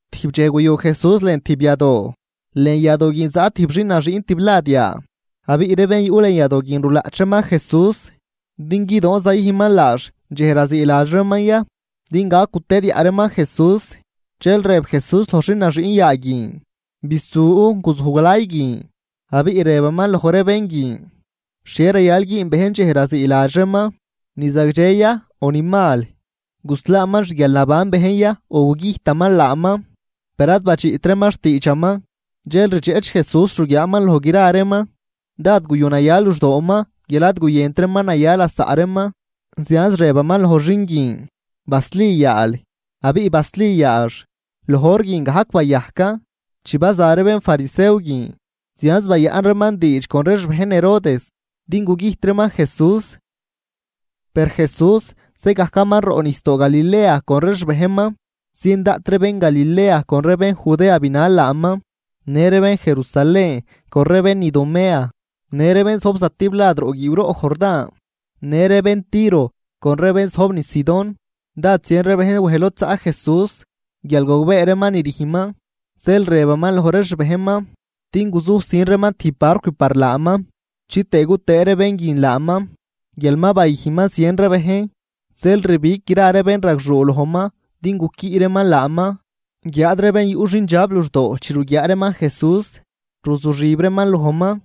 Tijb dxej guyu Jesús lën tijb yadoo. Lën yadoo guin zaꞌ tijb xin naxüꞌn tiblad yaa. Abiꞌ ree bén yuꞌ lën yadoo guin rulaꞌch reeman Jesús din guidoon zayüjnman laax dxej raziiladx reeman ya, din gac gutediaꞌ reeman Jesús. Dxel rëb Jesús loj xin naxüꞌn yaa guin: ―Bisu, guzuj galay guin. Abiꞌ rëbaman loj ree bén guin: ―¿Xhie rayal güün bejn dxej raziiladx reeman? ¿Ni zagdxe ya o ni mal? ¿Guslaaman xguialnaban bejn ya o gugüjtaman laaman? Per ad badxiꞌt reeman xtiidxaman. Dxel rdxeꞌch Jesús ruguiaaman loj gra reeman, dád guyunaya luxdooman guial ad guyënt reeman naya lasaꞌ reeman. Zianz rëbaman loj xin guin: ―Basli yaal. Abiꞌ basli yaax, loj hor guin gajc bayajcan. Chi baza ree bénfarisew guin, zianz bayaꞌn reeman diidx con ree xbejn Herodes din gugüjt reeman Jesús. Per Jesús zë gajcaman roꞌnijsdoo Galilea con ree xbejnman. Zien daꞌt ree bén Galilea con ree bén Judea binal laaman, në ree bén Jerusalén con ree bén Idumea, në ree bén zojb zatiblad roꞌ guiiwroꞌ Jordán, në ree bén Tiro con ree bén zojb niz Sidón. Dád zien ree bejn wej lod zaꞌ Jesús guial gogbee reeman ni rüjnman. Zeel rëbaman loj ree xbejnman din guzujsin reeman tijb barcw par laaman chitëë gutëë ree bén guin laaman. Guial ma bayüjnman zien ree bejn, zeel rbig gra ree bénragxuu lojman din guquiꞌ reeman laaman. Guiáad ree bén yuꞌ xindxab luxdoo chi ruguiaa reeman Jesús, ruzuxib reeman lojman,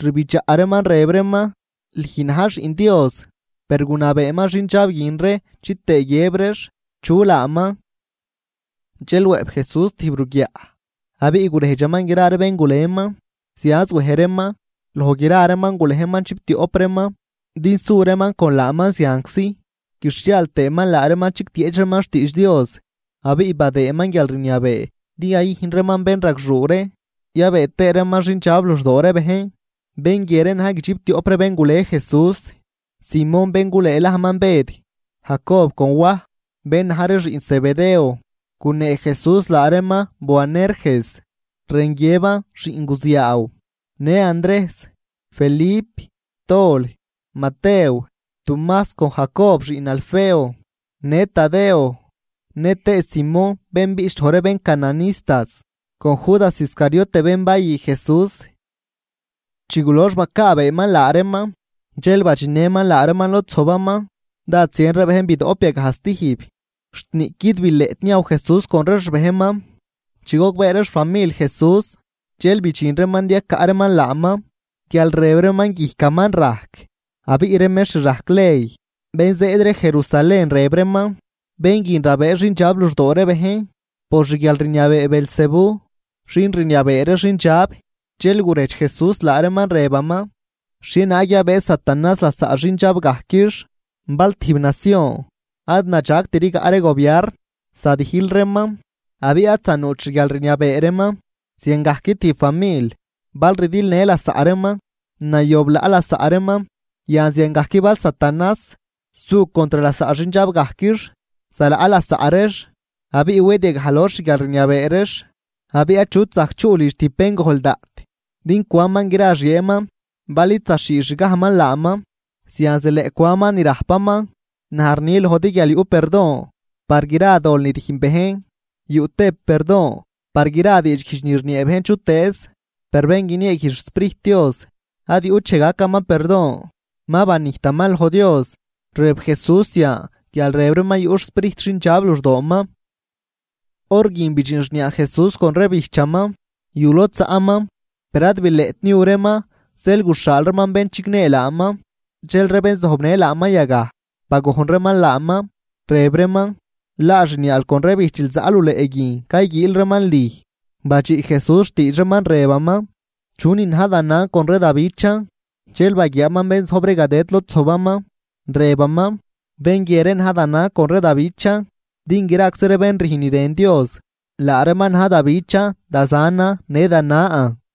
rbidxaꞌ reeman rëb reeman: ―¡Lüj na̱j Xiꞌn Dios! Per gunabeeman xindxab guin ree chitëë guiëb reex chu laaman. Dxel wëꞌp Jesús tijb ruguiaꞌ, abiꞌ gurejdxaman gra ree bén guleman. Zianz wej reeman, loj gra reeman gulejman chiptioꞌp reeman din su reeman con laaman zianczi guixhiaal tëëman laa reeman chigtieꞌch reeman xtiidx Dios. Abiꞌ badëëman guialrniabee din yayüjn reeman bénragxuu ree yabëë tëë reeman xindxab luxdoo ree bejn. Bén guie ree na̱j guidxiptioꞌp ree bén gule Jesús: Simón bén gulëëlajman Bëd, Jacob con Waj, bén na̱j ree xiꞌn Zebedeo, gunee Jesús laa reeman Boanerges (rën guiëban, xiꞌn guziaaw); në Andrejs, Felip, Tol, Matew, Tumajs con Jacob xiꞌn Alfeo, në Tadeo, nëtëë Simón bén biꞌch loj ree bén Cananistas, con Judas Iscariote bén bayü Jesús. Chi gulox bacaabeeman laa reeman dxel badxinnëman laa reeman lod zojbaman. Dád zien ree bejn bidoꞌp yagaj stijb, xt niꞌquid bileꞌt niajw Jesús con ree xbejnman. Chi gogbee ree xfamil Jesús, dxel bidxin reeman din yacaꞌ reeman laaman guial rëb reeman guijcaman rajc. Abiꞌ ree mextr rajc ley bén zëëd ree Jerusalén rëb reeman: ―Bén guin rabëë xindxab luxdoo ree bejn por xguialrniabee Beelzebú, xin rniabee ree xindxab. Dxel gurejdx Jesús laa reeman, rëbaman: ―¿Xhienaag yabëë satanás lasaꞌ xindxab gajquix? Bal tijb nacion, ad nadxagt rigaꞌ ree gobiarn, zadijl reeman abiꞌ ad zanuut xguialrniabee reeman, ziangajc tijb famil, bal rdilnë lasaꞌ reeman, nayob laꞌ lasaꞌ reeman. Yan, ziangajc bal satanás su contr lasaꞌ xindxabgajquix, zalaꞌ lasaꞌ reex abiꞌ wed yagaj lox xguialrniabee reex. ’Abiꞌ achut zajc chuꞌ lidx tijb béngojl daꞌt din cwanman gra xieenman bal id zaxhii xgajman laaman. Zian zileꞌ cwanman ni rajpaman. ’Naj rni lojdi guial yuꞌ perdon par gra dol ni rüjn bejn, yuꞌ tëë perdon par gra diidxguijdx ni rniee bejn chutëëz. Per bén guinieeguijdx xSprijt Dios, ad yuꞌt dxej gacaman perdon, ma banijtaman loj Dios. Rëb Jesús zian guial rëb reeman yuꞌ xsprijt xindxab luxdooman. Hor guin bidxin xniaa Jesús con ree bijchaman yu lod zaꞌman, per ad bileꞌt niu reeman zeel guxhaal reeman bén chignee laaman. Dxel ree bén zojbnë laaman yagaj bagojn reeman laaman, rëb reeman: ―Laa xniaal con ree bijchil zaꞌ luleꞌ guin cayguiil reeman lüj. Badxiꞌ Jesús xtiidx reeman rëbaman: ―¿Chunin na̱j da nan con ree da bichan? Dxel baguiaaman bén zojb ree gadëd lod zojbaman, rëbaman: ―Bén guie ree na̱j da nan con ree da bichan, din graczi ree bén rüjn ni rën Dios, laa reeman na̱j da bichan, da zanan në da nan.